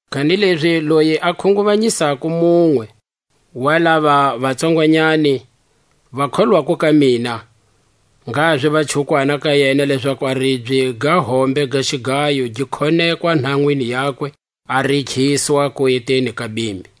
Kanilezi loyi a khunguvanyisako munwe wa lava va tsongwanyani va kholwako ka mina, ngha ziva chukwana ka yena lezaku a ribye ga hombe ga xigayo gi khonekwa nhanwini yakwe, a rikhiswa kueteni ka bimbi.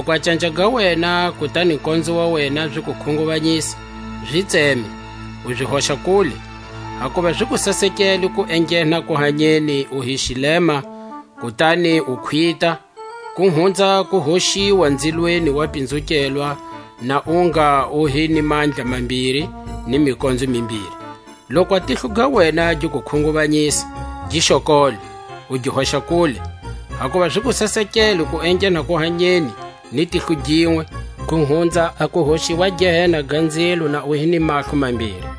Loku a canja ga wena kutani konzo wa wena zi ku khunguvanyisa, zi tseme, u zi hoxa kule; hakuva zi ku sasekele ku enghena kuhanyeni u hi xilema, kutani u khwita, ku hunza a ku hoxiwa nzilweni wa pinzukelwa na u ngha u hi ni mandla mambiri ni mikonzo mimbiri. Loku a tihlo ga wena gi ku khunguvanyisa, gi xokole, u gi hoxa kule; hakuva zi ku sasekele ku enghena kuhanyeni ni tihlo ginwe, ku hunza a ku hoxiwa Gehena ga nzilo na u hi ni mahlo mambiri.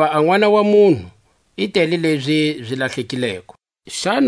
Hakuva a Nʼwana wa munhu i tele lezi zi lahlekileko. A yivu yi lahlekileko.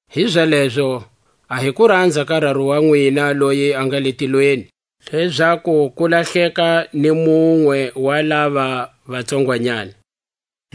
Hizalezo a hi kuranza ka Raru wa nwina loyi a nga le tilweni, lezaku ku lahleka ni munwe wa lava va tsongwanyani. Ku tsetselela makabye.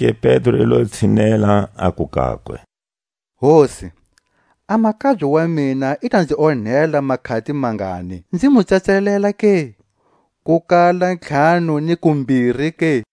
Zonake Pedro i lo tshinela, aku kakwe: Hosi, a makabye wa mina i ta nzi onhela makhati mangani, nzi mu tsetselela ke? Ku kala ntlhanu ni kumbiri ke?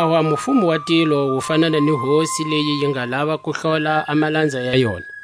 Hikwalaho a mufumo wa tilo wu fanana ni hosi leyi yi nga lava ku hlola a malanza ya yona.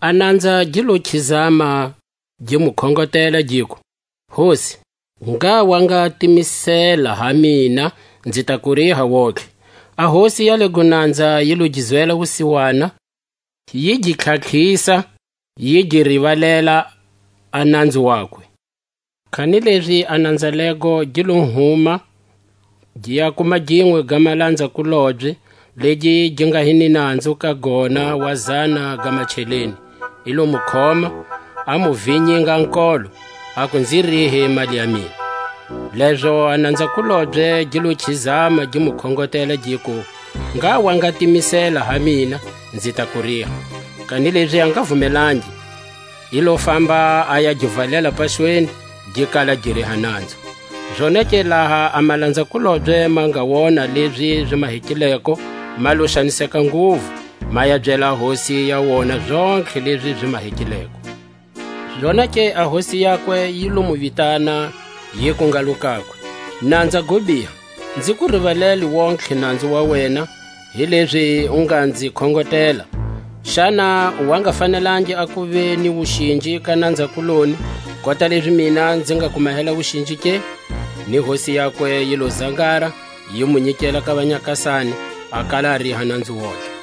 A nanza gi lo khizama, gi mu khongotela, giku: Hosi, ngha wa nga timisela ha mina, nzi ta ku riha wontihe. A hosi ya lego nanza, yi lo gi zwela wusiwana, yi gi tlhatlhisa, yi gi rivalela a nanzu wakwe. Kanilezi a nanza lego gi lo huma, gi ya kuma ginwe ga malanza-kulobye, legi gi nga hi ni nanzu ka gona wa zana ga macheleni; i lo mu khoma, a mu vinyinga a nkolo, aku; Nzi rihe mali ya mina. Lezo a nanza-kulobye gi lo khizama gi mu khongotela, giku: Ngha wa nga timisela ha mina, nzi ta ku riha. Kanilezi a nga vumelangi; i lo famba a ya gi valela paxweni, gi kala gi riha nanzu. Zonake laha a malanza-kulobye ma nga wona lezi zi mahekileko, ma lo xaniseka nguvu, ma ya byela a hosi ya wona zontlhe lezi zi mahekileko. Zonake a hosi yakwe yi lo mu vitana, yiku ngalo kakwe: Nanza go biha, nzi ku rivalele wontihe nanzu wa wena, hilezi u nga nzi khongotela; xana u wa nga fanelangi a kuva ni wuxinji ka nanza-kuloni, kota lezi mina nzi nga ku mahela wuxinji ke? Ni hosi yakwe yi lo zangara, yi mu nyikela ka vanyakasani, a kala a riha nanzu wontihe.